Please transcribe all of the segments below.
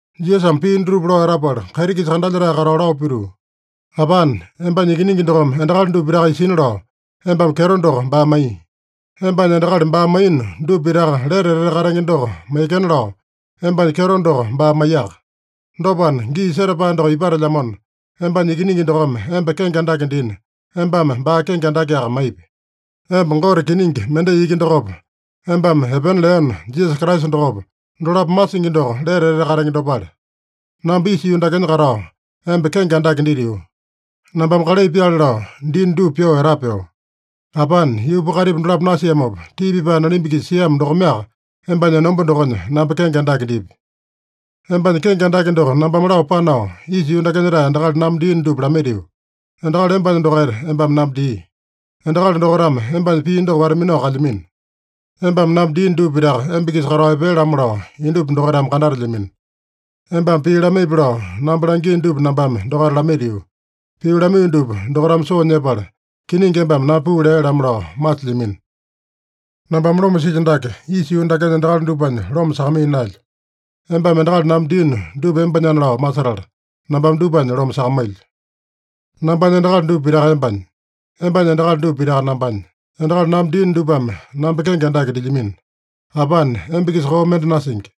Jisasame pii dutupa lao etapala, kaiti-kisa kandalyetae katao lao pituu, “Apane, embanya Ikiningi dokome endakali dupa pitaka isina lao, embame kyeto doko baa maiya. Embanya endakali baa maiyino dupa pitaka lete etete katenge doko maiyekena lao embanya kyeto doko baa maiyaka. Dopana, gii setapae doko ipatelyamona, embanya Ikiningi dokome emba kenge andake dina, embame baa kenge andakeaka maipi. Emba Gote kiningi mendai iki dokopa, embame epena leeno Jisasa Kraisa dokopa, dolapo masingi doko lete etete katenge dopale. Namba isa yuu dakenya katao, emba kenge andake ditio. Nambame kalai pyaale lao diino dupa pyoo etapeo. Apane, yuupa kaitipa dolapo nasiamopa tii pipae nalimba-kisa siamo dokomeaka embanya enomba dokonya namba kenge andake dipi. “Embanya kenge andake doko nambame lao panao, isa yuu dakenya-tae endakali namba diino dupa lamaitio. Endakali embanya dokaita embame namba dii. Endakali dokaitame embanya pii doko wata-minao kalyamino. Embame namba diino dupa pitaka emba-kisa katao epea-lamo lao indupa dokaitame kandatelyamino. Embame pii lamaipi lao namba langiino dupa nambame dokaita lamaitio. Pii lamaiyo dupa dokaitame soo nyepala, kiningi embame namba puu lea-lamo lao masilyamino. Nambame loma silyo dake, isa yuu dakenya endakali dupanya loma sakamaiya naelyo. Embame endakali namba diino dupa embanyana lao masetala, nambame dupanya loma sakamailyo. Nambanya endakali dupa pitaka embanya. Embanya endakali dupa pitaka nambanya. Endakali namba diino dupame namba kenge andake dilyamino. Apane, emba-kisa koo mende nasingi.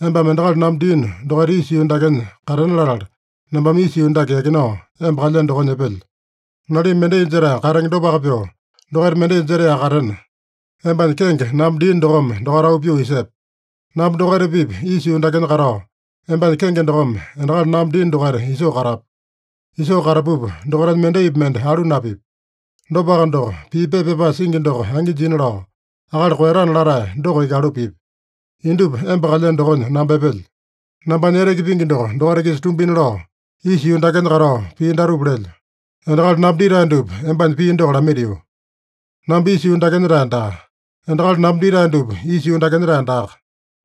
Embame endakali namba diino dokaita isa yuu dakenya katena latala, namba isa yuu dake yakinao, emba kalyeno dokonya epelyo. Nalimba mendai jetae katenge dopaka pyoo, dokaita mendai jetaeyaka katena, embanya kenge namba diino dokome dokaita auu pyoo isepe. Namba dokaita-pipa isa yuu dakenya katao, embanya kenge dokome endakali namba diino dokaita isoo katapu. Isoo katapupa dokaitanya mendaipi mende alu napipya. Dopaka doko, pii pepa pyapae singi doko angi jina lao, akali koeyatana latae doko iki alu pipya. Indupa emba kalyeno dokonya namba epelyo. Nambanya eteke pingi doko dokaita-kisa tumbina lao, isa yuu dakenya katao pii datupa lelyo. Endakali namba ditae dupa embanya pii doko lamaitio. Namba isa yuu dakenya-tae daa. Endakali namba ditae dupa isa yuu dakenya-tae daaka.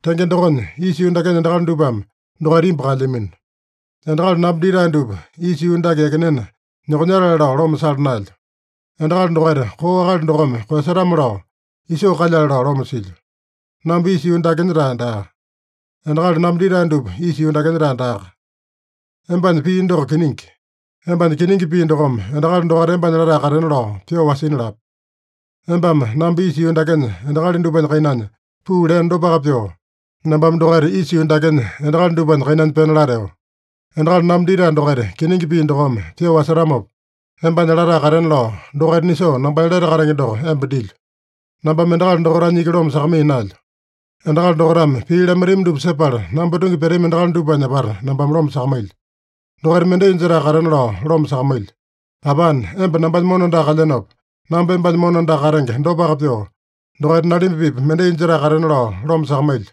Tenge dokonya, isa yuu dakenya endakali dupame dokaita imbu kaelyamino. Endakali namba ditae dupa isa yuu dake yakinena, nyokonyatale lao loma sala naelyo. Endakali dokaita koo akali dokome koeyasatame-lao isoo kalyale lao loma silyo. Namba isa yuu dakenya-tae daa. Endakali namba ditae dupa isa yuu dakenya-tae daaka. Embanya pii doko kiningi. Embanya kiningi pii dokome endakali dokaita embanya latae katena lao pyoo wasina lape. Embame namba isa yuu dakenya endakali dupanya kainanya puu leeno dopaka pyoo, nambame dokaita isa yuu dakenya endakali dupanya kainanya pena lateo. Endakali namba ditae dokaita kiningi pii dokome pyoo wasetamopa, embanya latae katena lao, dokaita nisoo nambanya lete katenge doko emba dilyo. “Nambame endakali dokaitanya iki loma sakamaiya naelyo. Endakali dokaitame pii lamaitami dupa sepala namba tungi pyatami endakali dupanya apata nambame loma sakamailyo. Dokaita mendai jetae katena lao loma sakamailyo. Apane, emba nambanya mona andaka kalyenopa, namba embanya mona andaka katenge dopaka pyoo, dokaita nalimba-pipa mendai jetae katena lao loma sakamailyo.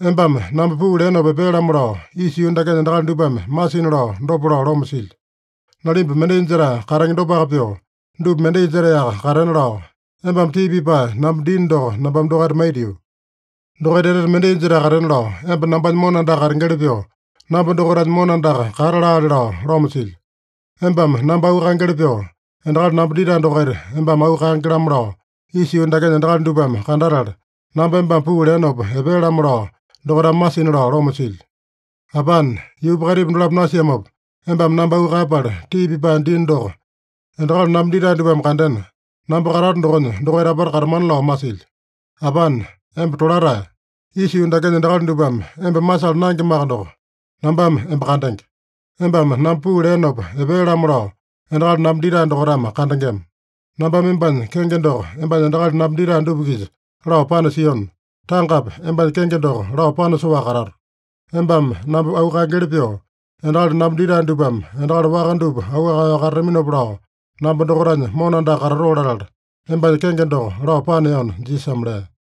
Embame namba puu leenopa epea-lamo lao isa yuu dakenya endakali dupame masina lao dopa lao loma silyo. Nalimba mendai jetae katenge dopaka pyoo, dupa mendai jetaeyaka katena lao, embame tii pipae namba diino doko nambame dokaita maitio. Dokaita etete mendai jetae katena lao, emba nambanya mona andaka katengeli pyoo namba dokaitanya mona andaka kata laale lao loma silyo. Embame namba auu kaengeli pyoo, endakali namba ditae dokaita embame auu kaenge-lamo lao, isa yuu dakenya endakali dupame kandatala, namba embame puu leenopa epea-lamo lao dokaitame masina lao loma silyo. Apane, yuupa kaitipa dolapo nasiamopa embame namba auu kaeyapala tii pipae diino doko endakali namba ditae dupame kandena, namba katato dokonya dokaita apata katatamana lao masilyo. Apane, emba tolatae. Isa yuu dakenya endakali dupame emba masala naengemaka doko, nambame emba kandenge. Embame namba puu leenopa epea-lamo lao endakali namba ditae dokaitame kandengema. Nambame embanya kenge doko embanya endakali namba ditae dupa-kisa lao panasiona, tangapi embanya kenge doko lao panasoaka katato. Embame namba auu kaengeli pyoo, endakali namba ditae dupame endakali waka dupa auu kaeyao katataminopa lao, namba dokaitanya mona andaka katatoo latala, embanya kenge doko lao paneona” Jisasame lea.